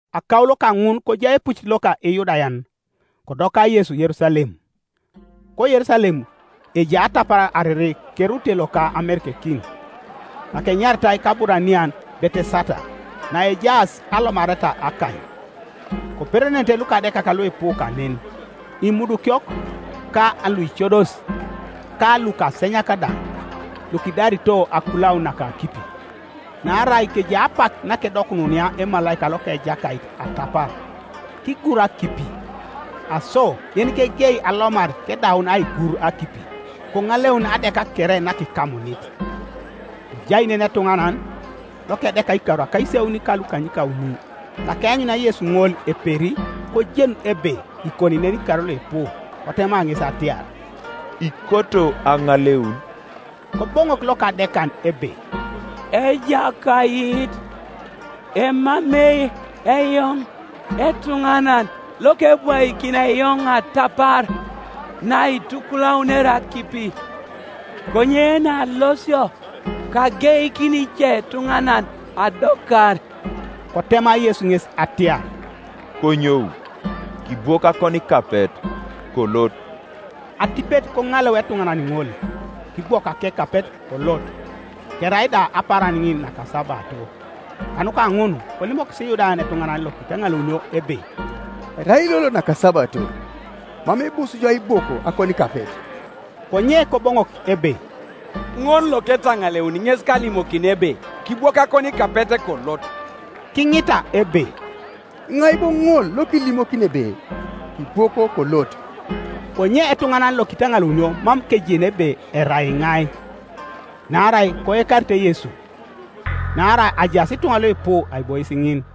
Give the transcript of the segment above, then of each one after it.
Akaulo kaŋun kojai epucit loka Iyudayan, kodoka Yesu Yerusalem. KoYerusalem ejai atapar ariri kerute loka amerekekin, nakenyaritai kAburanian Betesata, naejaas alomareta akany. Koperenenete lukadekak luipu kanen, imudukiok, ka luicodos, ka lukasenyak da, [lukidarito akulaun naka akipi, Naarai kejai apak nakedokununia emalaika loka Ejakait atapar, kigur akipi: aso yenikegei alomar kedaun aigur akipi koŋaleuni adeka kere nakikamunit.] Kojai nen etuŋanan, lokedeka ikar akaisauni ka lukanykauni. Nakeanyunia Yesu ŋol eperi kojen ebe kikoni nen ikar luipu, kotema ŋes atiar, “Ikoto aŋaleun?” Koboŋok lokadekan ebe, “Ejakait, emamei eoŋ etuŋanan lokebwaikini eoŋ atapar naitukulaunere akipi, konye naalosio, kageikini icetuŋanan adokar.” Kotema Yesu ŋes atiar, “Konyou, kibwok akonikapet, kolot.” Atipet koŋaleu etuŋanan ŋol, kibwok akekapet, kolot. Kerai da apaaran ŋin nakasabato. Kanuka ŋun kolimokis Iyudayan etuŋanan lokitaŋaleunio ebe, “Erai lolo nakasabato, mam ibus jo aibwok akonikapet.” Konye Koboŋok ebe, “Ŋol loketaŋaleuni ŋes kalimokini ebe, ‘Kibwok akonikapet, kolot.’” Kiŋita ebe, “Iŋai bo ŋol lokilimokini ebe, ‘Kibwok, kolot?’” Konye etuŋanan lokitaŋaleunio mam kejeni ebe erai iŋai, naarai koekarite Yesu, naarai ajaas ituŋa luipu aibois ŋin.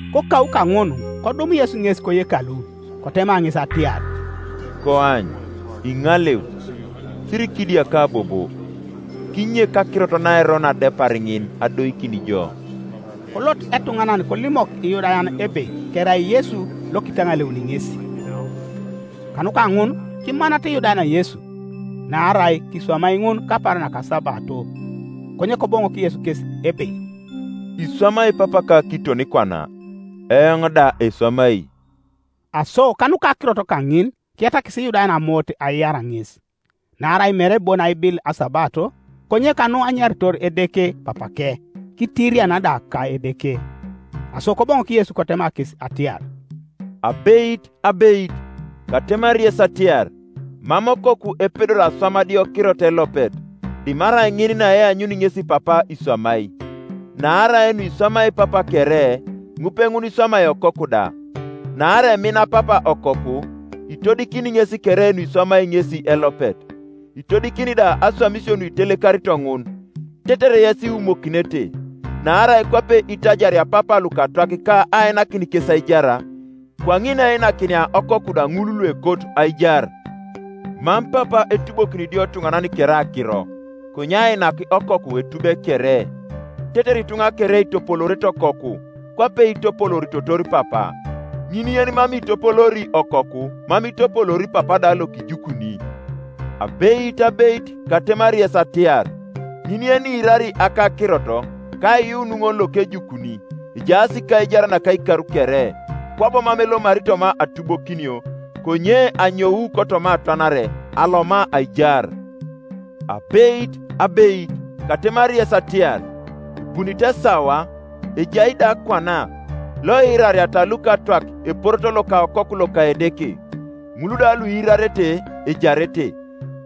Kokau kaŋun kodum Yesu ŋes koyekalu, kotema ŋes atiar, “Koany, iŋaleu! Sirikidiaka bobo, kinyek akirot naerono adepar ŋin adoikin jo.” Kolot etuŋanan kolimok Iyudayan ebe kerai Yesu lokitaŋaleuni ŋes. Kanuka ŋun kimanata Iyudayan Yesu, naarai kiswamai ŋun kapaaran nakasabato. Konye Koboŋok Yesu kes ebe, “Iswamai Papaka kiton kwana, eoŋ da eswamai.” Aso kanuka akirot kaŋin kiyatakis Iyudayan amoot aiar Ŋes, naarai mere bon aibil asabato, konye kanu anyaritor Edeke Papake, kitiriana da ka Edeke. Aso Koboŋok Yesu kotema kes atiar, “Abeit, abeit, katemari yes atiar, Mam Okoku epedori aswam adiokirot elopet, dimarai ŋin naeanyuni ŋesi Papa iswamai; naarai nuiswamai Papa kere, ŋupeŋun iswamai Okoku da. Naarai emin Papa Okoku, itodikini ŋes kere nuiswamai ŋesi elopet; itodikini da aswamisio nuitelekarito ŋun, tetere yes iwumokinete. Naarai kwape itajaria Papa lukatwak ka ainakin kes aijar, kwaŋin einakinia Okoku da ŋul luekot aijar. Mam Papa etubokini idiotuŋanan kere akiro, konye ainak Okoku etube kere, tetere ituŋa kere itopoloorete Okoku, kwape itopolooritotor Papa. Ŋin yenimam itopoloori Okoku mam itopoloori Papa da lokijukuni. Abeit, abeit, katemari yes atiar, ŋin yeniirari akakirot ka aiyuun ŋol lokejukuni, ejaas kaijar naka ikar kere; kwabo mam elomari toma atubokinio, konye anyou kotoma atwanare aloma aijar. “Abeit, abeit, katemari yes atiar, Ebunit esawa, ejai da kwana, loiirariata lukatwak eporoto loka Okoku loka Edeke, ŋul da luiirarete ejarete.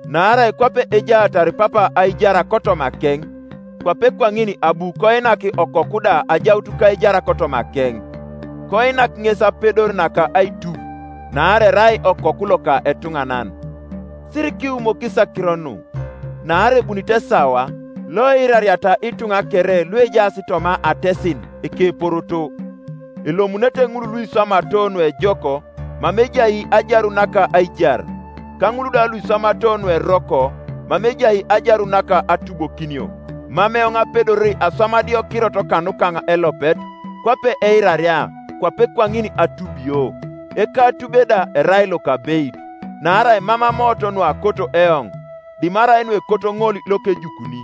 Naarai kwape ejaatar Papa aijar kotomakeŋ, kwape kwaŋin abu koinak Okoku da ajaut kaijar kotomakeŋ; koinak ŋes apedor naka aitub, naarai erai Okoku loka etuŋanan, Sirikiwumokis akiro nu; naarai ebunit esawa, loiirariata ituŋa kere luejaas toma atesin ekeporoto, elomunete; ŋul luiswamato nuejok mama ejai ajarun naka aijar; ka ŋul da luiswamato nueroko, mama ejai ajarun naka atubokinio. “Mam eoŋ apedori aswam adiokirot kanukaŋ elopet; kwape eiraria, kwape kwaŋin atubio: ekatube da erai lokabeit, naarai mam amoot nuakot eoŋ dimarai nuekot ŋol lokejukuni.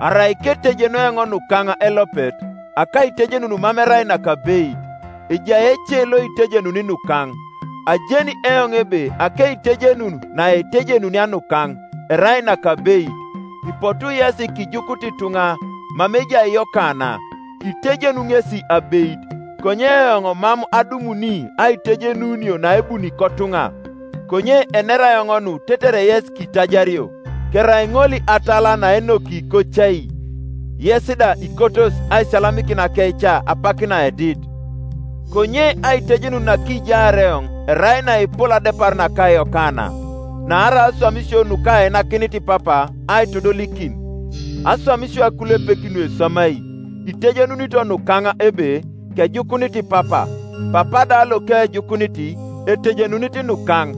Arai ketejenu eoŋ nukaŋ elopet, akaitejenun mam erai nakabeit; ejai ece loitejenuni nukaŋ, ajeni eoŋ ebe akeitejenun naitejenunia nukaŋ erai nakabeit. Ipotu yesi kijukut ituŋa mama ejai Yokana, kitejenu ŋesi abeit. Konye eoŋ mam adumuni aitejenunio naebuni kotuŋa; konye enera eoŋ nu tetere yes kitajario. Kerai ŋol atala naenoki kocai, yes da ikotos aisiyalamikin akeica apak naedit. Konye aitejenun nakijaar eoŋ erai naepol adepar naka Yokana; naarai aswamisio nukainakinit Papa aitodolikin, aswamisio akulepek nueswamai, itejenunito nukaŋ ebe, kejukunit Papa. Papa da lokejukunit, etejenunit nukaŋ,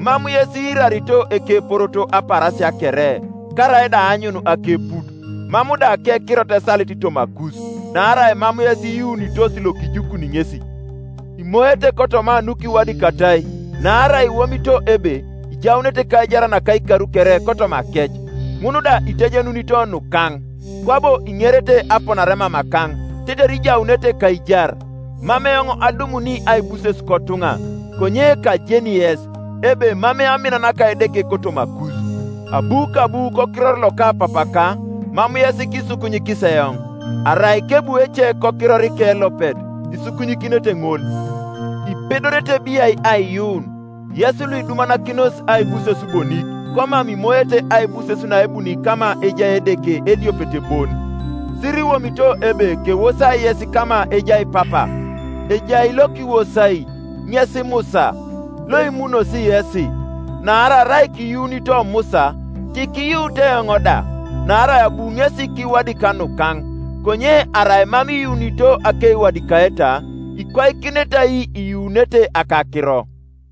Mam yes iirarito ekeporoto apaarasia kere, karaida aanyun akeput. Mam da akekirot esalit tomakus, naarai mam yes iyuunitos lokijukuni ŋesi. Imoete kotoma nukiwadikatai, naarai iwomito ebe ijaunete kaijar naka ikar kere kotomakec; ŋun da itejenunito nukaŋ; kwabo iŋerete aponare mamakaŋ tetere ijaunete kaijar. Mam eoŋ adumuni aibuses kotuŋa. Konye kajeni yes, ebe emamei amin naka Edeke kotomakus. Abu kabu kokiror loka Papaka, mam yes kisukunyikis eoŋ; arai kebu ece kokirorike elopet, isukunyikinete ŋol. Ipedorete biai aiyuun, yes luidumanakinos aibuses bonik komam imoete aibuses naebuni kama ejai Edeke ediopet bon? Siriwomito ebe kewosai yes kama ejai Papa; ejai lokiwosai, ŋes Musa, loimunosi yesi. Naarai arai kiyuunito Musa, tikiyuut eoŋ da, naarai abu ŋesi kiwadika nukaŋ. Konye arai mam iyuunito akeiwadikaeta, ikwaikinete ai iyuunete akakiro?”